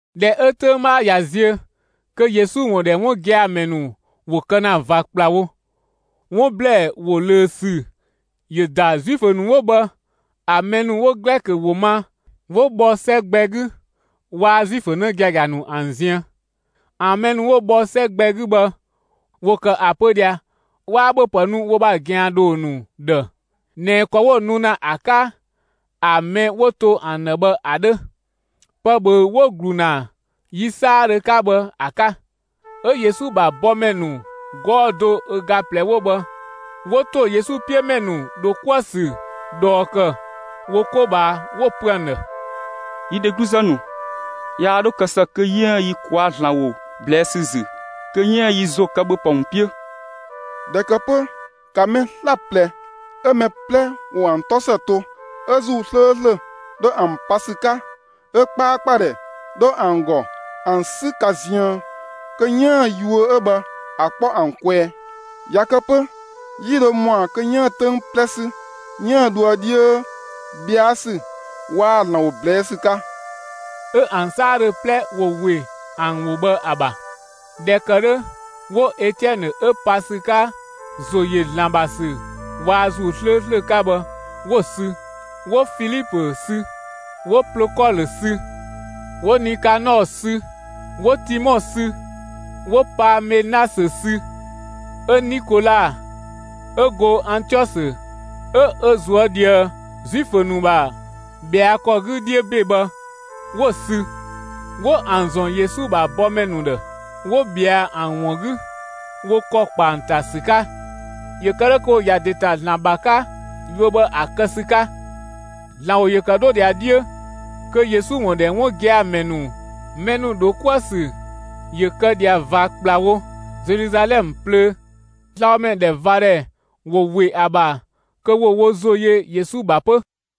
꞊Dhɛ 'ö 'töng 'bhaa ꞊ya ziö, kö Yesu ‑wun ‑dhɛ 'wun gia‑ ‑mɛ ‑nu ‑wo kë ‑na ꞊va ‑kplawo, 'wun ‑blɛɛ ‑wo ꞊löö ‑sü ‑yö ‑da Zuifö ‑nu 'wo bhë ‑an mɛ ‑nu 'wo Glɛkö ‑wo ma 'wo bhɔ 'sɛ gbɛ 'gü waa‑ Zuifö 'në giagia ‑nu ‑an ziën. ‑An mɛ ‑nu 'wo bhɔ 'sɛ gbɛ 'gü bhë ‑wo ‑kë ‑a pö ꞊dhia 'waa ‑bhöpë nu wo ‑bha ꞊gɛandhoo ‑nu ‑dhë ꞊nɛ ‑kɔ 'wo‑ nu ‑na ‑a 'ka ‑a mɛ 'wo to ‑an ‑dhë bhë ‑a 'dhö, pë ꞊bhöü‑ 'wo‑ ‑glu ‑na yi 'saadhö 'ka bhë ‑a 'ka. 'Ö Yesu ‑bha bɔmɛ ‑nu 'gɔɔ‑ do ö ga ꞊plɛ 'wo bhë 'wo ‑to Yesu 'piö ‑mɛ ‑nu ‑dho 'kuë‑ ‑sü ꞊dhɔɔ ‑kë wo 'ko ꞊bhaa, 'wo‑ pö ‑an ‑dhë: «Yi dhegluzë ‑nu, yaa 'dho kë ‑së kö 'yiën‑ yi ꞊kwaa'‑ ‑Zlan ‑wo ꞊blɛɛ' ‑sü ‑zü kö 'yiën‑ yi ‑zo kë ‑bhöpë ‑wun 'piö! ꞊Dhɛ ‑kë 'pö, ‑ka mɛ 'slaplɛ 'ö mɛ 'plɛ ‑wo ‑an 'tɔ ‑së to 'ö ‑Zuu 'slööslö 'dhö ‑an pa ‑sü 'ka, 'ö 'kpaakpadhɛ 'dho ‑an ‑gɔ ‑an 'sü ka ziën kö 'yiën‑ yuö 'ö bhë ‑a kpɔ ‑an kwɛɛ. ꞊Ya kë 'pö, 'yi ‑dho ‑mɔa kö 'yiën‑ 'töng 'plɛ 'sü 'yiën‑ dhoë 'dhiö, ꞊bhɛa' ‑sü waa‑ ‑Zlan ‑wo ꞊blɛɛ' ‑sü 'ka.» 'Ö ‑an 'saadhö 'plɛ ‑wo ‑we ‑an ‑wo bhë ‑a ‑bha. ꞊Dhɛ ‑kë 'dhö 'wo Etiɛnë 'ö pa ‑sü 'ka ‑zo ‑yö ‑Zlan ‑bha ‑sü waa‑ ‑Zuu 'slööslö 'ka bhë, 'wo‑ sü. 'Wo Filipö sü, 'wo Plokɔlö sü, 'wo Nikanɔɔ sü, 'wo Timɔ sü, 'wo Paamenasö sü, 'ö Nikola 'ö go Antiɔsö 'ö ö ꞊zuö' ꞊dhië Zuifö ‑nu ‑bha ꞊bhɛa' ‑kɔ 'gü 'dhiö ‑be bhë, 'wo‑ sü. 'Wo ‑an ‑zɔn Yesu ‑bha bɔmɛ ‑nu ‑dhë; 'wo ꞊bhɛa ‑an ‑wun 'gü wo ‑kɔ ‑kpa ‑an ‑ta ‑sü 'ka, ‑yö kë 'dhö kö ‑wo ‑ya ‑de ‑ta ‑Zlan ‑bha 'ka yuö bhë ‑a kë ‑sü 'ka. ‑Zlan ‑wo ‑yö ‑kë 'dho ꞊dhia 'dhiö, kö Yesu ‑wun ‑dhɛ 'wun gia‑ ‑mɛ ‑nu ‑dho 'kuë‑ ‑sü ‑yö kë ꞊dhia ꞊va ‑kplawo Zeluzalɛmë plöö; slabhomɛ ‑dhɛ ꞊va ‑dhɛ ‑wo ‑we ‑a ‑bha kö ‑wo wo ‑zo yö Yesu ‑bha 'pö.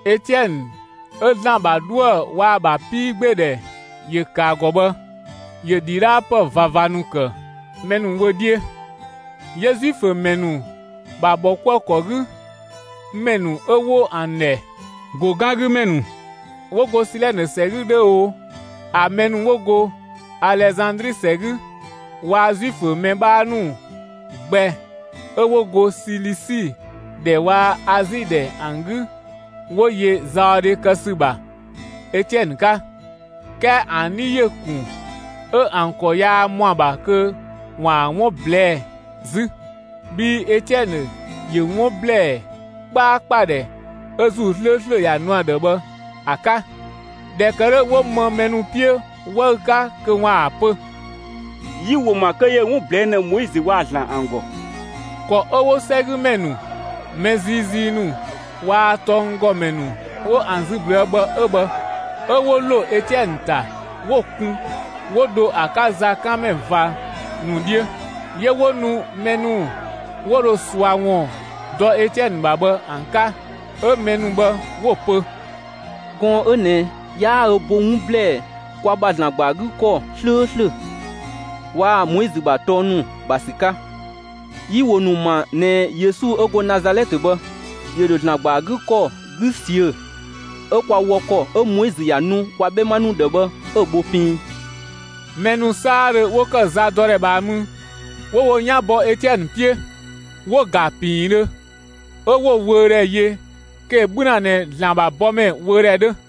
Etiɛnë 'ö ‑Zlan ‑bha 'dhuë‑ waa‑ ‑bha 'piigbeedhɛ ‑yö ‑kë ‑a ‑gɔ bhë, ‑yö ‑dhidhaapë ꞊vava ‑nu ‑kë mɛ ‑nu wö 'dhiö. 'Yö Zuifö ‑mɛ ‑nu ‑bha ‑bhɔkuëkɔ 'gü ‑mɛ ‑nu 'ö 'wo ‑an ‑dhɛ «‑go 'gan 'gü ‑mɛ ‑nu» 'wo go Silɛnë ‑sɛ 'gü 'dhö oo, ‑a mɛ ‑nu ‑wo go Alezandri ‑sɛ 'gü waa‑ Zuifö mɛ 'bhaa ‑nu gbɛ 'ö 'wo go Silisi ‑dhɛ waa‑ Azi ‑dhɛ ‑an 'gü 'wo yö zaɔdhe kë ‑sü ‑bha Etiɛnë 'ka. 'Kɛɛ ‑an 'dhi ‑yö ‑kun 'ö ‑an ‑kɔ yaa ‑mɔa ‑bha kö ‑waan 'wun ꞊blɛɛ'‑ 'zü, bhii Etiɛnë ‑yö 'wun ‑blɛɛ 'kpaakpadhɛ 'ö ‑Zuu 'slööslö ‑ya nu ‑a ‑dhë bhë ‑a 'ka. ꞊Dhɛ ‑kë 'dhö, 'wo më mɛ ‑nu 'piö 'wëü‑ 'ka kö ‑waan ‑a pö: «Yi‑ ‑wo ‑ma kö ‑yö 'wun ꞊blɛɛ' ‑na Moizö waa‑ ‑Zlan ‑an ‑gɔ.» ‑Kɔ 'ö 'wo 'sɛgümɛ ‑nu, mɛ ziizii ‑nu waa‑ tɔnggɔmɛ ‑nu 'wo ‑an zü ꞊blüë' bhë 'ö bhë. 'Ö 'wo ‑lo Etiɛnë ‑ta 'wo‑ kun 'wo dho ‑a 'ka zakanmɛ ꞊va ‑nu 'dhiö. 'Yö 'wo nu mɛ ‑nu 'wo dho ꞊sua ‑wun dɔ Etiɛnë ‑bha bhë ‑an 'ka 'ö mɛ ‑nu bhë 'wo‑ pö: «Gɔɔn‑ 'ö ꞊nɛ 'yaa ö bo 'wun ꞊blɛɛ' kwa ‑bha ‑Zlan ‑gba ‑a 'gü ‑kɔ 'slööslö waa‑ Moizö ‑bha tɔng ‑nu ‑bha ‑sü 'ka. Yi‑ ‑wo ‑nu ‑ma ꞊nɛ Yesu 'ö go Nazalɛtë bhë ‑yö ‑dho ‑Zlan ‑gba ‑a 'gü ‑kɔ 'gü ꞊siö' 'ö kwa wɔ ‑kɔ 'ö Moizö ‑ya nu kwa 'bhɛma ‑nu ‑dhë bhë 'ö‑ bho piin.» Mɛ ‑nu 'saadhö 'wo ‑kë za 'kënng 'gü mü, 'wo wo 'yan bɔ Etiɛnë 'piö, 'wo‑ ‑ga ‑piindhö 'ö 'wo‑ wöödhɛ yö kö ‑yö 'bhü ‑na ꞊nɛ ‑Zlan ‑bha bɔmɛ wöödhɛ 'dhö.